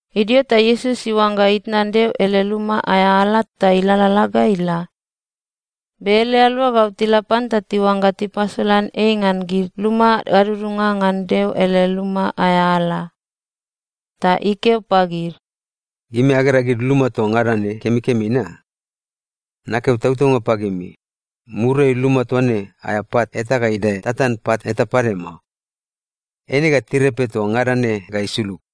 Idio ta Iesus iuangga itnan Deo ele luma aea ala ta ilalala ga ila. Be ele aluagau tila pan ta tiuangga tipasolan ei ngan gid luma gadudunga ngan Deo ele luma aea ala. Ta ikeo pagid, “Gimi agera gid luma toa ngada ne kemikemi na? Nakeo tautaunga pagimi, muriai luma toa ne aea pat eta ga idae tatan pat eta pade mao. Eine ga tirepe toa ngada ne ga isulug.”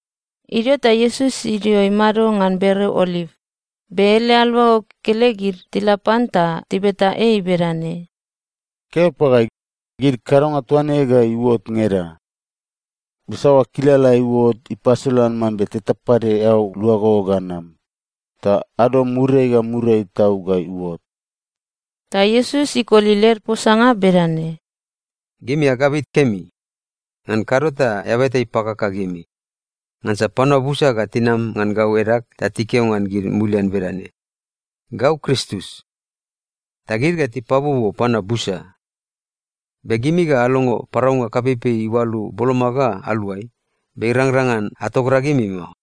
Idio ta Iesus idio imado ngan bereo Oliv, be ele aluagau kekelegid tila pan ta tibeta ei bedane, “Keo pagai, gid kadonga toa ne ga iuot ngeda? Be saoa kilala ga iuot ta ipasolan mambe teta pade eao luago ga nam, ta ado muriai ga muriai tau ga iuot?” Ta Iesus ikoli led posanga bedane, “Gimi agabit kemi. Ngan kado ta eaba eta ipakaka gimi. Ngansa panua busa ga tinam ngan gau edag ta tikeo ngan gid mulian bedane, ‘Gau Kristus.’ Ta gid ga tipabuobuo panua busa. Be gimi ga alongo paraunga kapeipei iualu boloma ga aluai, be irangrang ngan atogragimi mao.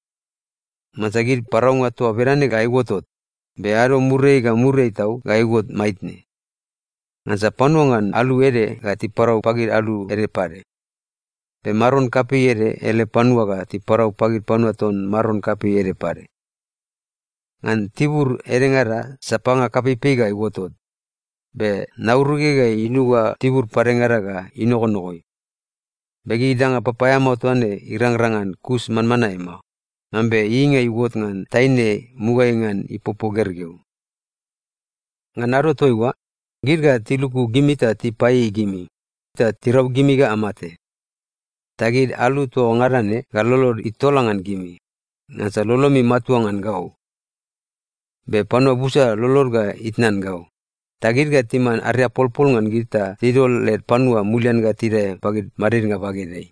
Ngansa gid paraunga toa bedane ga iuotot, be ado muriai ga muriai tau ga iuot maitne. Ngansa panua ngan alu ede ga tiparau pagid alu ede pade, be maron kapei ede ele panua ga tiparau pagid panua ton maron kapei ede pade. Ngan tibur edengada sapanga kapeipei ga iuotot, be nauruge ga inuga tibur padengada ga inogonogoi. Be gid danga papaeamao toa ne irangrang ngan kus manmanae mao, mambe ieieinga iuot ngan taine mugaeai ngan ipopo gergeu. “Ngan ado toaiua, gid ga tiluku gimi ta tipaieiei gimi, ta tirau gimi ga amate. Ta gid alu toa ngada ne ga lolod itola ngan gimi, ngansa lolomi matua ngan gau. Be panua busa lolod ga itnan gau, ta gid ga timan ariapolpol ngan gid ta tidol led panua mulian ga tidae pagid madidnga bagedeai.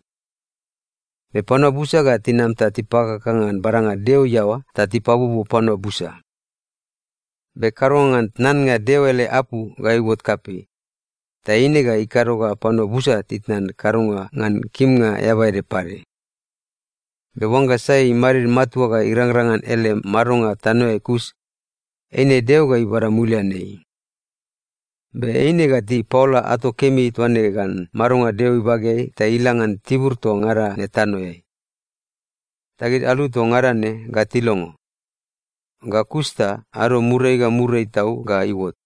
Be panua busa ga tinam ta tipakaka ngan badanga Deo iaoa ta tipabuobuo panua busa. Be kadonga ngan tnannga Deo ele apu ga iuot kapei, ta eine ga ikado ga panua busa titnan kadonga ngan kimnga eaba ede pade. Be oangga sai imadid matua ga irangrang ngan ele madonga tanoeai kus, eine Deo ga ibada mulian ei. Be eine ga tipaola ato kemi toa ne ngan madonga Deo ibageai ta ila ngan tibur toa ngada ne tanoeai. Ta gid alu toa ngada ne ga tilongo. Ga kus ta ado muriai ga muriai tau ga iuot.”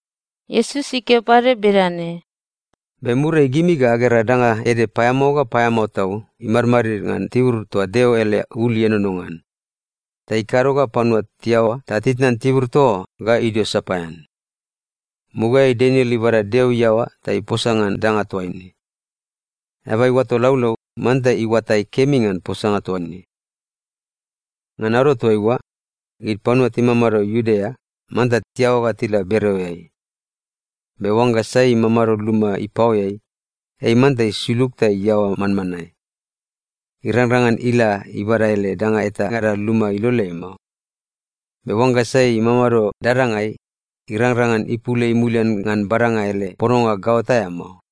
Iesus ikeo pade bedane, “Be muriai gimi ga agera danga ede paeamao ga paeamao tau imadmadid ngan tibur toa Deo ele ul ienono ngan, ta ikado ga panua tiaoa ta titnan tibur toa oa ga idio sapaean. Mugaeai Daniel ibada Deo iaoa ta iposa ngan danga toaine. (Eaba iuato laulau, manta iuatai kemi ngan posanga toa ne.) Ngan ado toaiua, gid panua timamado Iudea, manta tiaoa ga tila bereoeai. Be oangga sai imamado luma ipaoeai, ei manta isulug ta iaoa manmanae. Irangrang ngan ila ibada ele danga etangada luma iloleai mao. Be oangga sai imamado dadangai, irangrang ngan ipul ei mulian ngan badanga ele pononga gaot aea mao.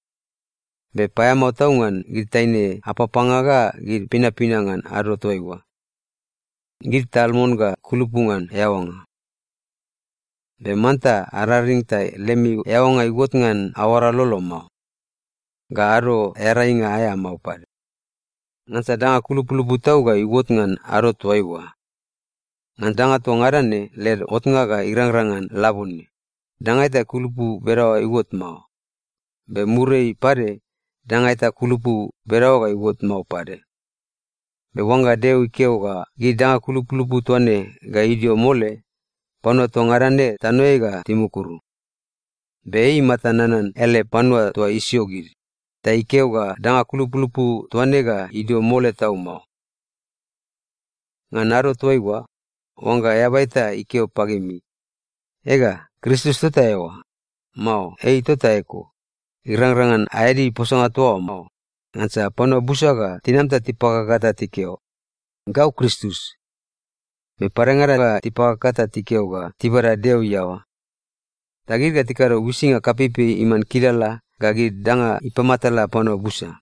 Be paeamao tau ngan gid taine apapanga ga gid pinapina ngan ado toaiua. Gid tal mon ga kulupu ngan eaoanga. Be manta araring ta lemi eaoanga iuot ngan aoara lolo mao, ga Ado Earainga aea mao pade. Ngansa danga kulupulupu tau ga iuot ngan ado toaiua. Ngan danga toa ngada ne led otnga ga irangrang ngan labone, danga eta kulupu bedaoa iuot mao, be muriai pade danga eta kulupu bedaoa ga iuot mao pade. Be oangga Deo ikeo ga gid danga kulupulupu toa ne ga idio mole, panua toa ngada ne tanoeai ga timukuru. Be ei imata nanan ele panua toa isio gid, ta ikeo ga danga kulupulupu toa ne ga idio mole tau mao. “Ngan ado toaiua, oangga eaba eta ikeo pagimi, ‘Ega, Kristus tota eoa!’ mao ‘Ei tota eko!’ irangrang ngan aeadi posanga toa oa mao. Ngansa panua busa ga tinam ta tipakaka ta tikeo, ‘Gau Kristus.’ Be padengada ga tipakaka ta tikeo ga tibada Deo iaoa. Ta gid ga tikado uisinga kapeipei iman kilala ga gid danga ipamatala panua busa.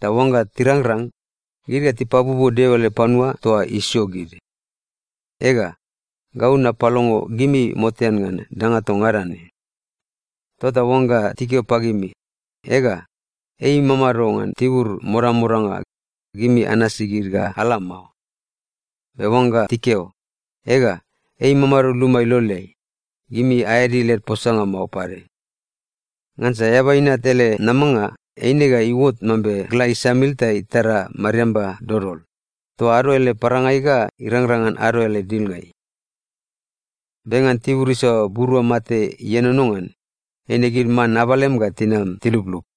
Ta oangga tirangrang, gid ga tipabuobuo Deo ele panua toa isio gid. Ega, gau napalongo gimi motean ngan danga toa ngada ne. “Tota oangga tikeo pagimi, ‘Ega, ei imamado ngan tibur modamodanga,’ gimi anasi gid ga ala mao. Be oangga tikeo, ‘Ega, ei imamado luma iloleai,’ gimi aeadi led posanga mao pade. Ngansa Eaba Inat ele namanga eine ga iuot mambe gla isamil ta itara mariamba dodol, toa ado ele parangai ga irangrang ngan ado ele dilngai. Be ngan tibur isaoa burua mate ienono ngan, eine gid man abalem ga tinam tiluplup.”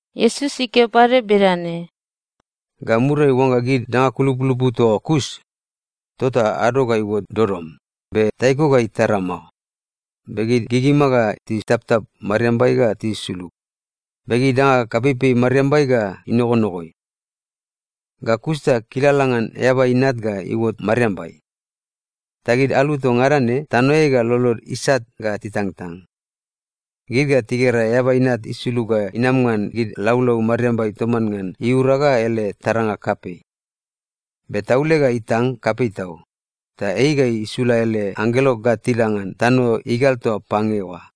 Iesus ikeo pade bedane, “Ga muriai oangga gid danga kulupulupu toa oa kus, tota “‘ado ga iuot dodom, be taiko ga itara mao, be gid gigima ga titaptap mariambai ga tisulug, be gid danga kapeipei mariambai ga inogonogoi.’ “Ga kus ta kilala ngan Eaba Inat ga iuot mariambai. Ta gid alu toa ngada ne tanoeai ga lolod isat ga titangtang. Gid ga tigera Eaba Inat isulug ga inam ngan gid laulau mariambai toman ngan iura ga ele taranga kapei. Be taule ga itang kapei tau, ta ei ga isula ele anggelo ga tila ngan tano igal toa pange oa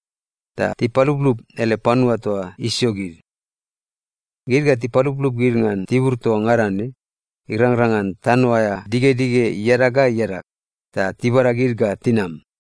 ta tipaluplup ele panua toa isio gid. Gid ga tipaluplup gid ngan tibur toa ngada ne, irangrang ngan tano aea digedige iadag ga iadag, ta tibada gid ga tinam.”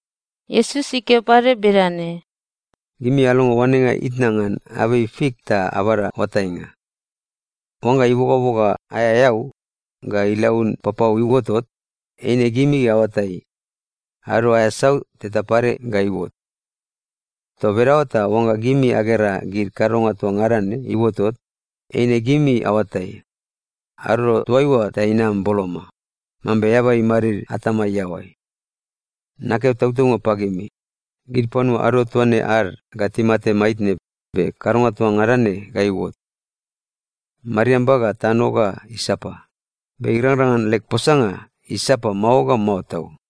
Iesus ikeo pade bedane, “Gimi alongo oanenga itna ngan abei fik ta abada oatainga. Oangga ibogaboga aea eau, ga ilaun papau iuotot, eine gimi aoatai, ado aea sau teta pade ga iuot. Toa bedaoa ta oangga gimi agera gid kadonga toa ngada ne iuotot, eine gimi aoatai, ado toaiua ta inam boloma, mambe eaba imadid atama iaoai. Nakeo tautaunga pagimi, gid panua ado toa ne ad ga timate maitne be kadonga toa ngada ne ga iuot. Mariamba ga tano ga isapa, be irangrang ngan leg posanga isapa mao ga mao tau.”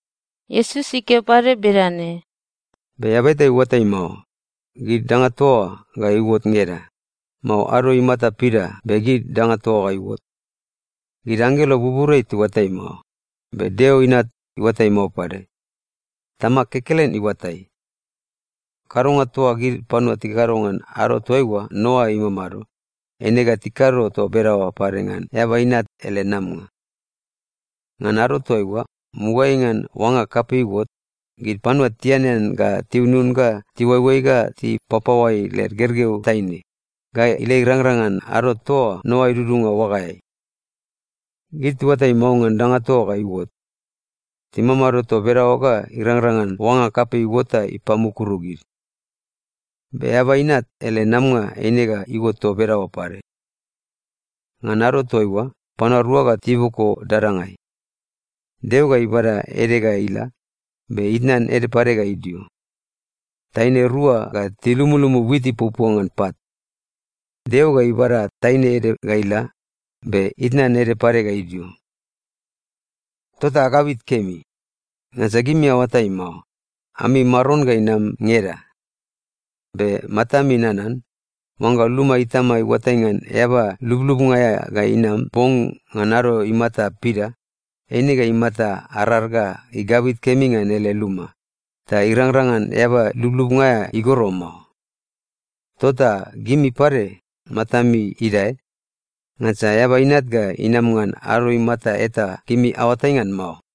Iesus ikeo pade bedane, “Be eaba eta iuatai mao, gid danga toa oa ga iuot ngeda, mao ado imata pida be gid danga toa oa iuot. Gid anggelo buburiai tiuatai mao, be Deo Inat iuatai mao pade. Tamag kekelen iuatai. Kadonga toa gid panua tikakado ngan ado toaiua Noa imamado, eine ga tikado toa bedaoa pade ngan Eaba Inat ele namanga. Ngan ado toaiua, mugaeai ngan oanga kapei iuot, gid panua tianean ga tiunun ga tiuaioai ga tipapaoai led gergeu taine, ga ila irangrang ngan ado toa Noa idudunga oagaeai. Gid tiuatai mao ngan danga toa oa ga iuot. Timamado toa bedaoa ga irangrang ngan oanga kapei iuot ta ipamukuru gid. Be Eaba Inat ele namanga eine ga iuot toa bedaoa pade. Ngan ado toaiua, panua rua ga tiboko dadangai. Deo ga ibada ede ga ila, be itnan ede pade ga idio. Taine rua ga tilumulumu wit ipuapua ngan pat. Deo ga ibada taine ede ga ila, be itnan ede pade ga idio. “Tota agabit kemi. Ngansa gimi aoatai mao, ami Maron ga inam ngeda. Be matami nanan: Oangga luma itama iuatai ngan eaba lublubnga aea ga inam bong ngan ado imata pida, eine ga imata arar ga igabit kemi ngan ele luma, ta irangrang ngan eaba lublubnga aea igoro mao. Tota gimi pade matami idae, ngansa Eaba Inat ga inama ngan ado imata eta gimi aoatai ngan mao.”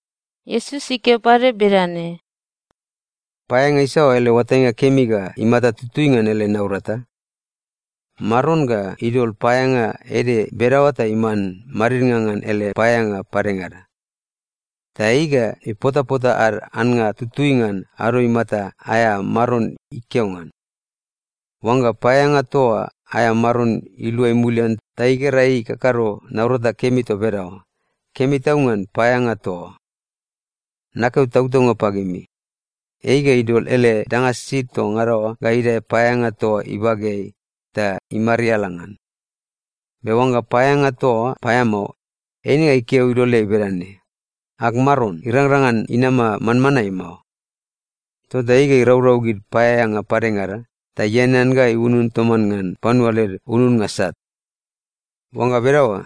Iesus ikeo pade bedane, “Paeaeanga isaoa ele oatainga kemi ga imata tutui ngan ele naurata? Maron ga idol paeaeanga ede bedaoa ta iman madidnga ngan ele paeaeanga padengada. Ta ei ga ipotapota ad annga tutui ngan ado imata aea maron ikeo ngan. Oangga paeaeanga toa oa aea maron iluai mulian ta igera ei ikakado naurata kemi toa bedaoa, kemi tau ngan paeaeanga toa oa! Nakeo tautaunga pagimi, ei ga idol ele danga sisid toa ngada oa ga idae paeaeanga toa oa ibageai ta imariala ngan. Be oangga paeaeanga toa oa paeamao, eine ga ikeo iloleai bedane, ‘Ag maron irangrang ngan inama manmanae mao.’ Tota ei ga iraurau gid paeaeanga padengada ta ianean ga iunun toman ngan panua led ununnga sat. Oangga bedaoa,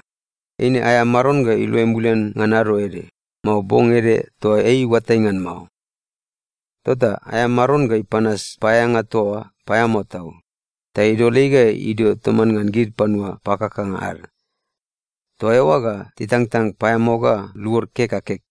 eine aea maron ga iluai mulian ngan ado ede, mao bong ede toa ei iuatai ngan mao. Tota aea maron ga ipanas paeaeanga toa oa paeamao tau, ta idol ei ga idio toman ngan gid panua pakakanga ad. Toa eoa ga titangtang paeamao ga luod kek ga kek.”